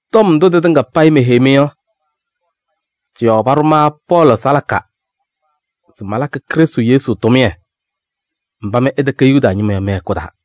Tɔm ndʋ tɩtɩŋa payɩ meheyi-mɩ yɔ, tɩ-yɔɔ paɖʋ ma Pɔɔlɩ salaka se malakɩ Krɩstʋ Yesu tʋmɩyɛ mba mɩ ɩtɛkɛ Yuda ñɩma yɔ mɩ-hɛkʋ taa.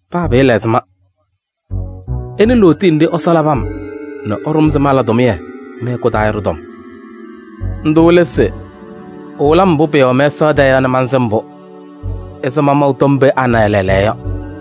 Paa pɩɩla ɛzɩma, ɩnɩ lootiye nɖɩ Ɛsɔ labɩ-m nɛ ɛɖʋ-m se mala tʋmɩyɛ mɩ-hɛkʋ taa yɔ ɖɩ-tɔm. Ndʋ lɛ se ɛwɩlɩ-m mbʋ pɩɩwɛ mɛsaɣ tɛɛ yɔ nɛ mansɩm-pʋ ɛzɩ mamaʋ tɔm pee ana lɛɛlɛɛyɔ yɔ.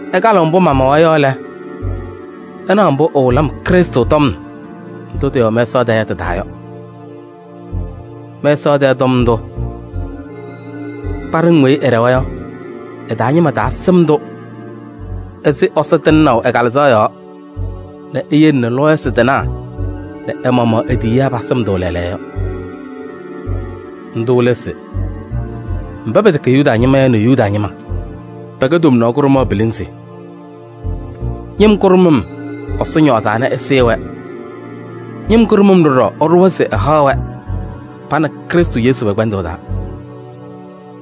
Ɩkalɩɣ mbʋ mamawa yɔ lɛ, ɩna mbʋ ɛwɩlɩ-m Krɩstʋ tɔm ndʋ tɩɩwɛ mɛsaɣ tɛɛ yɔ tɩ-taa yɔ. Mɛsaɣ tɛɛ tɔm ndʋ, kpaɖɩŋ weyi ɩɖɛwa yɔ, ɩ-taa ñɩma taasɩm-tʋ ɛzɩ Ɛsɔ tɩŋnaʋ ɛ-Kalɩzaɣ yɔɔ nɛ eyele nɛ lɔɔyɩsɩ tɩnaa nɛ ɛ-maɣmaɣ e-tiyiyaa pasɩm-tʋ lɛɛlɛɛyɔ yɔ. Ndʋ lɛ se: mba pɛtɛkɛ Yuda ñɩma yɔ nɛ Yuda ñɩma, pɛkɛ tomnaɣ kʋɖʋmaɣ pilinzi. Ñɩm kʋɖʋmʋm Ɛsɔ ñɔɔzaa nɛ ɛsɩɩ-wɛ. Ñɩm kʋɖʋmʋm ɖɔɖɔ ɛɖʋwa se ɛhaɣ-wɛ pa nɛ Krɩstʋ Yesu pɛ-kpɛndʋʋ taa.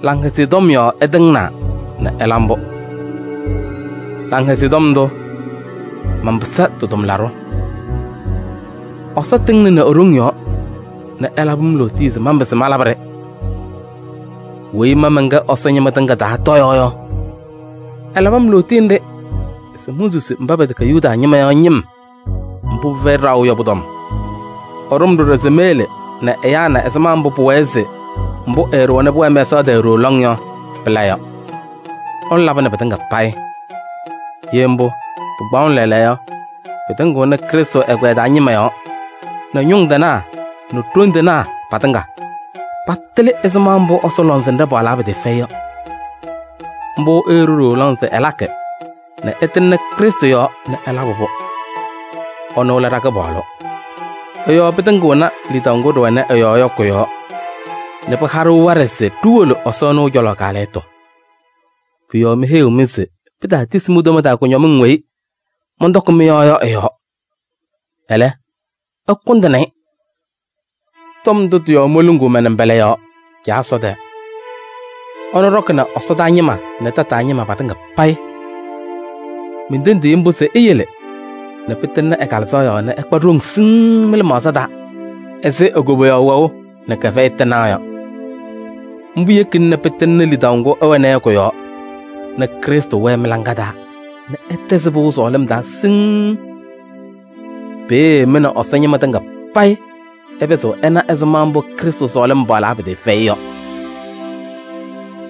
Laŋhɛzɩyɛ Tɔm yɔɔ ɛtɩŋnaa nɛ ɛla mbʋ. Laŋhɛzɩyɛ Tɔm ndʋ, manpɩsɩ tɩ-tʋmlaɖʋ. Ɛsɔ tɩŋnɩnɩ e-ɖoŋ yɔɔ nɛ ɛlabɩ-m lootiye se manpɩzɩ malabɩ-ɖɩ. Weyi ma mɛnkɛ Ɛsɔ ñɩma tɩŋa taa tɔyaɣ yɔ, ɛlabɩ-m lootiye nɖɩ se monsusi mba pɛtɛkɛ Yuda ñɩma yɔ ñɩm mbʋ pɩfɛyɩ ɖaɣʋ yɔ pʋ-tɔm. Ɛɖʋ-m ɖɔɖɔ se meyele nɛ ɛyaa na ɛzɩma mbʋ pʋwɛɛ se mbʋ ɛɛɖʋwa nɛ pʋwɛɛ mɛsaɣ tɛɛ ɖooo lɔŋ yɔ, pɩla yɔ. Ɛnʋ labɩnɩ pɩtɩŋa payɩ. Ye mbʋ, pɩkpaɣʋnɩ lɛɛlɛɛyɔ yɔ, pɩtɩŋɩɣnɩ Krɩstʋ ɛgbɛyɛ taa ñɩma yɔɔ nɛ ñʋŋ tɩnaa nɛ ɛsɔdaa ɖoŋ tɩŋa patɩlɩ ɛzɩma mbʋ Ɛsɔ lɔŋsɩnɖɛ paɣlaa pɩtɩɩfɛyɩ yɔ. Mbʋ ɛɛɖʋ ɖooo lɔŋ se ɛlakɩ nɛ ɛtɩŋnɩ Krɩstʋ Yesu yɔɔ nɛ ɛlabɩ-pʋ. Ɛnʋ lɛ ɖa-Kɩpaɣlʋ. Ɛ-yɔɔ pɩtɩŋɩɣnɩ lidaʋ ŋgʋ ɖɩwɛnɩ ɛ-yɔɔ yɔ kʋ-yɔɔ nɛ pɩhaɣ-ɖʋ waɖɛ se ɖiwolo Ɛsɔ cɔlɔ kaalɛyɩtʋ. Pʋ-yɔɔ meheyiɣ-mɩ se pitaatisi mi-toma taa kʋñɔmɩŋ weyi mɔntɔkɩ mɩ-yɔɔ yɔ ɩ-yɔɔ. Ɛlɛ, ɩkʋndɩnɩ-ɩ. Tɔm ndʋ tɩ-yɔɔ moluŋuu ma-nɩmbɔla yɔɔ Caa Ɛsɔ tɛɛ. Ɛnʋ ɖɔkɩnɩ ɛsɔdaa ñɩma nɛ tataa ñɩma patɩŋa payɩ. Mentendiɣ-i mbʋ se eyele nɛ pɩtɩŋnɩ ɛ-Kalɩzaɣ yɔɔ nɛ ɩkpa ɖoŋ siŋŋ mɩ-lɩmaɣza taa ɛzɩ e-koboyaɣ wɛʋ nɛ kɛfɛyɩ tɩnaɣ yɔ. Mbʋ yekina nɛ pɩtɩŋnɩ lidaʋ ŋgʋ ɩwɛna yɔ kʋ-yɔɔ nɛ Krɩstʋ wɛɛ mɩ-laŋa taa nɛ ɩtɛzɩ pɩʋ sɔɔlɩm taa siŋŋ. Peeye mɩ nɛ Ɛsɔ ñɩma tɩŋa payɩ ɩpɩzɩɣ ɩna ɛzɩma mbʋ Krɩstʋ sɔɔlɩm paɣlaa pɩtɩɩfɛyɩ yɔ: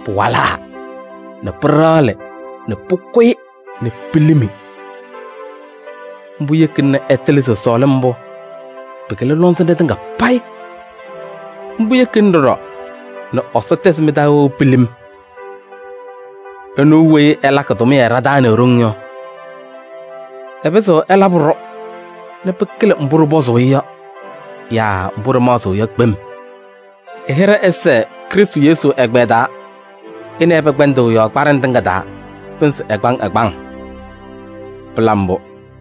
pɩwalaa nɛ pɩɖaɣlɩ nɛ pʋkʋyɩ nɛ pilimi. Mbʋ yekina nɛ ɩtɩlɩ se sɔɔlɩm mbʋ pɩkɩlɩ lɔŋsɩnɖɛ tɩŋa payɩ. Mbʋ yekina ɖɔɖɔ nɛ Ɛsɔ tɛzɩ mɩ-taa wɛʋ pilim. Ɛnʋ weyi ɛlakɩ tʋmɩyɛ ɖa-taa nɛ e-ɖoŋ yɔ, ɛpɩzɩɣ ɛlabɩ-ɖʋ nɛ pɩkɩlɩ mbʋ ɖɩpɔzʋʋ-ɩ yɔ yaa mbʋ ɖɩmaɣzɩɣ yɔ kpem. Ɛ-hɩɖɛ ɛsɛɛ Krɩstʋ Yesu ɛgbɛyɛ taa ɛ nɛ ɩ pɛ-kpɛndʋʋ yɔɔ kpaɖɩŋ tɩŋa taa pɩnzɩ ɛgbaŋ ɛgbaŋ! Pɩla mbʋ.